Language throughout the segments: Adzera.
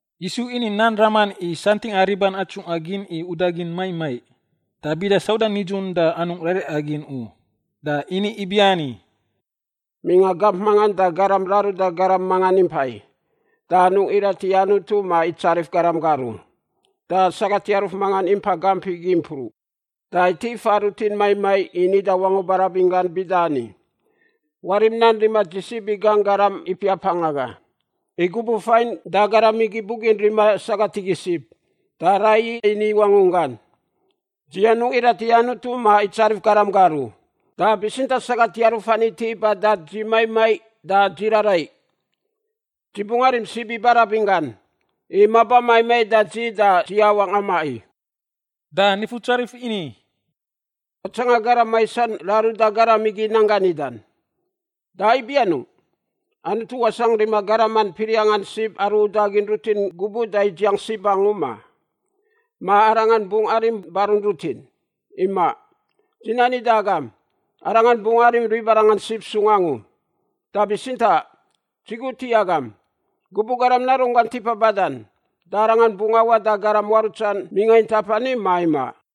Yisu ini nan raman i santingꞌa riban atsungꞌa gin i udagin maiꞌ maiꞌ, da bida sauda nidzun da anungꞌ raraiꞌa gin u. Da ini ibiani, “Mingꞌa gamp mangan da garam raruda garam mangan impai, da anungꞌ irat i Anutu ma itsarif garam gar u. Da sagat yaruf mangan impai gamp igi mpruꞌ, da iti fa rutin maiꞌ maiꞌ i nida wangu barabin gan bida ani, ‘Warim nan rima dzi sib i gangꞌ garam ipiapangꞌ aga.’ I gubuꞌ fain da garam igi bugin rima sagat igi sib, da raiyi ini i wangunggan, ‘Dzi anungꞌ irat i Anutu ma itsarif garam gar u, da bitsintaꞌ sagat yaruf ani iti ba da dzi maiꞌ maiꞌ da dzi raraiꞌ. Dzi bungꞌ arim sib i barabin gan, i maba maiꞌ maiꞌ da dzi da dzi awangꞌ amaꞌ i.’” Da Nifutsarif ini, “Watsanga garam maisan raruda garam igi nan gan nidan. Da ibi anungꞌ? Anutu wasangꞌ rima garaman piriangꞌan sib aru udagin rutin gubuꞌ da idziang sib angu, ma? Ma Arangan bungꞌ arim barun rutin? Imaꞌ! Dzi nani da agam, Arangan bungꞌ arim ribarangan sib sung angu. Da bitsintaꞌ, dzi gut i agam, gubuꞌ Garam Narunggan tipa badan, da Arangan bungꞌ awaꞌ da garam muarutsan mingꞌa intap ani ma imaꞌ?”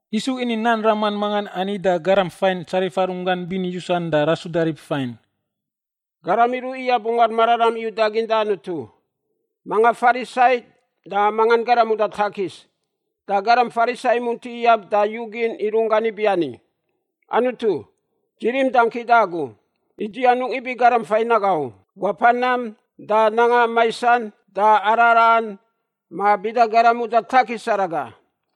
Yisu ini nan raman mangan ani da garam fain tsarifa runggan bini yusan da rasuda rib fain, “Garam iruꞌ iyab Ungar Mararam i udagin da Anutu, manga Farisai da manga garam uda takis. Da garam Farisai imunti iyab da iyugin i runggan ibiani, ‘Anutu, dzi rim dangki da agu, i dzi anungꞌ ibi garam fain aga u — wapa nam, da nanga maisan, da araraꞌan ma bida garam uda takis araga.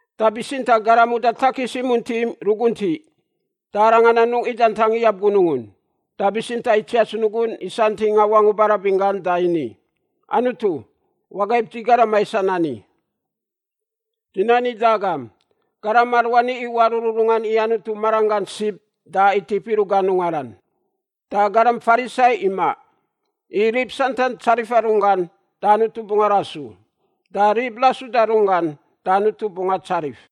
“Da bitsintaꞌ garam uda takis imunti ruguntiꞌ. Da arangan anungꞌ idantang iyab gunungun, da bitsintaꞌ itsiats nugun i santingꞌa wangun barabin gan da ini, ‘Anutu, wagaib dzi garam maisan ani.’ “Dzi nani da agam, garam aruani iwaꞌ rururungan i Anutu maranggan sib da itip iruꞌ gan ungaran, da garam Farisai imaꞌ. I rib santan tsarifa runggan da Anutu bungꞌ arasu, da rib rasuda runggan da Anutu bungꞌ atsarif.”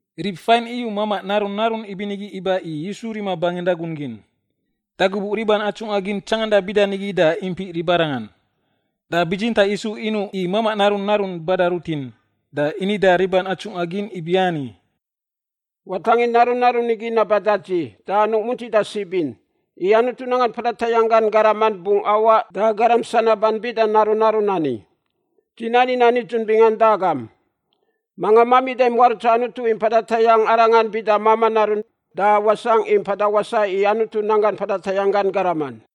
Rib fain iyu mamaꞌ narun narun ibinigi iba i Yisu rima bangin ragun gin. Da gubuꞌ riban atsungꞌa gin tsanganda bida nigi da impiꞌ ribarangan. Da bitsintaꞌ Yisu inuꞌ i mamaꞌ narun narun bada rutin, da ini da riban atsungꞌa gin ibiani, “Watangin narun narun igi naba da dzi da anungꞌ muntida sib in, i Anutu nanggan mpada tayangꞌ gan garaman bungꞌ awaꞌ da garam sanaban bida narun narun ani. Dzi nani nan nidzun bingan da agam, manga mamida muarutsa Anutu i mpada tayangꞌ arangan bida mamaꞌ narun da wasangꞌ i mpada wasaꞌ i Anutu nanggan mpada tayangꞌ gan garaman.”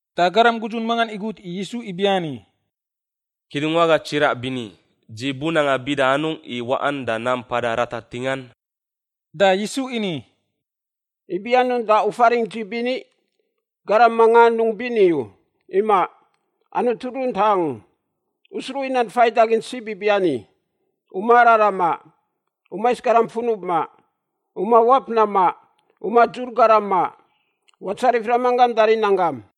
Da garam gudzun mangan igut i Yisu ibiani, “Kidungwaga tsiraꞌ bini, dzi bunanga bida anungꞌ i waꞌan da nam mpada ratar ntingan?” Da Yisu ini, “Ibi anungꞌ da u faringꞌ dzi bini? Garam manga anungꞌ bini u. Imaꞌ. Anutu runtaꞌ angu. U sruꞌ i nan faidagin sib ibiani, ‘U ma araraꞌ maꞌ. U mais garam funub maꞌ. U mawap nam maꞌ. U madzur garam maꞌ. Watsarif ramanggam da rinanggam.’”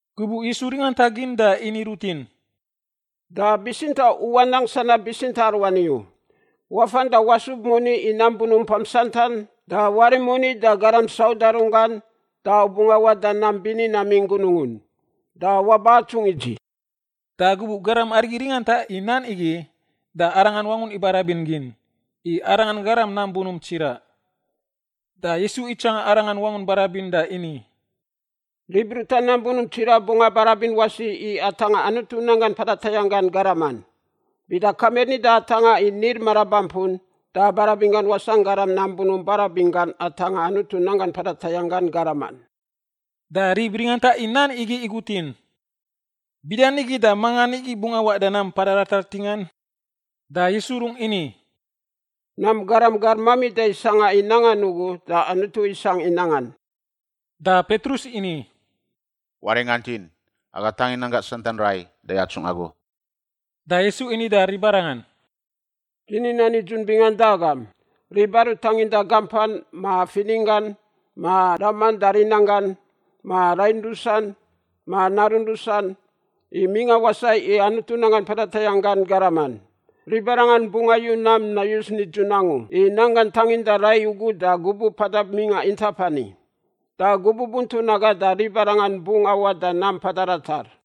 Gubuꞌ Yisu ringantagin da ini rutin, “Da bitsintaꞌ u wanang sanab bitsintaꞌ aruani u. Wafan da wasub moni i nam bunumpam santan da warim moni da garam sauda runggan da u bungꞌ awaꞌ da nam bini namingꞌ Gunungun. Da waba atsungꞌ i dzi.” Da gubuꞌ garam arigi ringanta i nan igi, da arangan wangun ibarabin gin, i arangan garam nam bunump tsiraꞌ. Da Yisu itsanga arangan wangun ibarabin da ini, “Rib ruta nam bunump tsiraꞌ bungꞌ abarabin wasi i atangꞌa Anutu nanggan mpada tayangꞌ gan garaman. Bida kamir nida i atangꞌa i nil marabampun da barabin gan wasangꞌ garam nam bunump barabin gan atangꞌa Anutu nanggan mpada tayangꞌ gan garaman.” Da rib ringanta i nan igi igutin, “Bidanigi da mangan igi bungꞌ awaꞌ da nam mpada ratar ntingan?” Da Yisu rungꞌ ini, “Nam garam gar mamida i sangꞌa i nangan ugu da Anutu isangꞌ i nangan.” Da Petrus ini, “Waringantin, aga tangin nanggangꞌ santan rai da yatsungꞌ agu.” Da Yisu ini da ribarangan, “Dzi ni nan nidzun bingan da agam, rib aru tanginda gampan, ma fininggan, ma raman da rinanggan, ma rain rusan, ma narun rusan, i mingꞌa wasaꞌ i Anutu nanggan mpada tayangꞌ gan garaman, ribarangan bungꞌ ayu nam nayus nidzun angu i nanggan tanginda rai ugu da gubuꞌ mpada mingꞌa intap ani, da gubuꞌ buntun aga da ribarangan bungꞌ awaꞌ da nam mpada ratar.”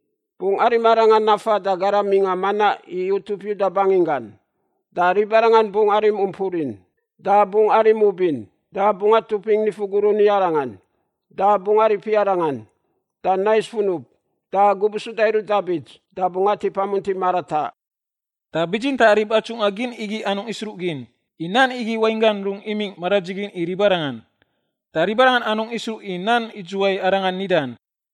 Bungꞌ arim Arangan nafan da garam mingꞌa manaꞌ i utup Yuda banginggan. Da ribarangan bungꞌ arim umpurin, da bungꞌ arim ubin, da bungꞌ atupingꞌ nifu gurun i Arangan, da bungꞌ aripi Arangan, da nais funub. Da gubuꞌ suda iruꞌ da bits da bungꞌ atip amunti marataꞌ.” Da bitsintaꞌ rib atsungꞌa gin igi anungꞌ isruꞌgin, i nan igi wainggan rungꞌ imingꞌ maradzigin i ribarangan. Da ribarangan anungꞌ isruꞌ i nan idzuwai Arangan nidan.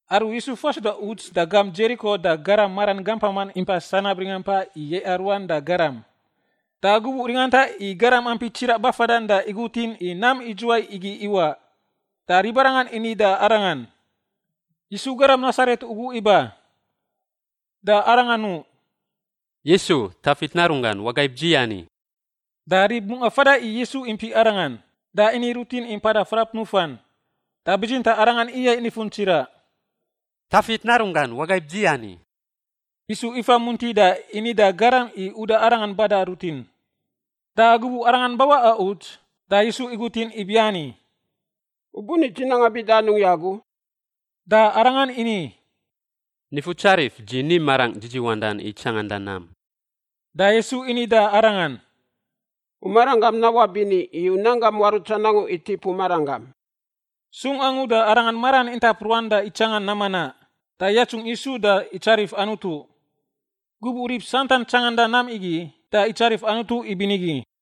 Aru Yisu fasuda uts da Dzeriko da garam maran gampaman impa sanab ringampa i yaiꞌa ruan da garam. Da gubuꞌ ringanta i garam ampi tsiraꞌ bafadan da igutin i nam idzuwai igi iwaꞌ. Da ribarangan ini da arangan, “Yisu garam Nasaret ugu iba.” Da aranga nuꞌ, “Yisu, Tafit Narunggan, wagaib dzi ani!” Da rib mungꞌa fada i Yisu impiꞌ arangan, da ini rutin i mpada frap nufan. Da bitsintaꞌ arangan iyaiꞌ nifun tsiraꞌ, “Tafit Narunggan, wagaib dzi ani!” Yisu ifa munti da ini da garam i uda arangan bada rutin. Da gubuꞌ arangan bawaꞌa uts, da Yisu igutin ibiani, “U buni dzi nanga bida anungꞌ i agu?” Da arangan ini, “Nifutsarif, dzi ni marangꞌ dzidziwandan i tsanganda nam.” Da Yisu ini da arangan, “U maranggam nawaꞌ bini i u nanggam muarutsan angu itip u maranggam.” Sung angu da aranga maran intap ruan da itsanga nam manaꞌ, da yatsungꞌ Yisu da itsarif Anutu. Gubuꞌ rib santan tsangandan nam igi, da itsarif Anutu ibinigi.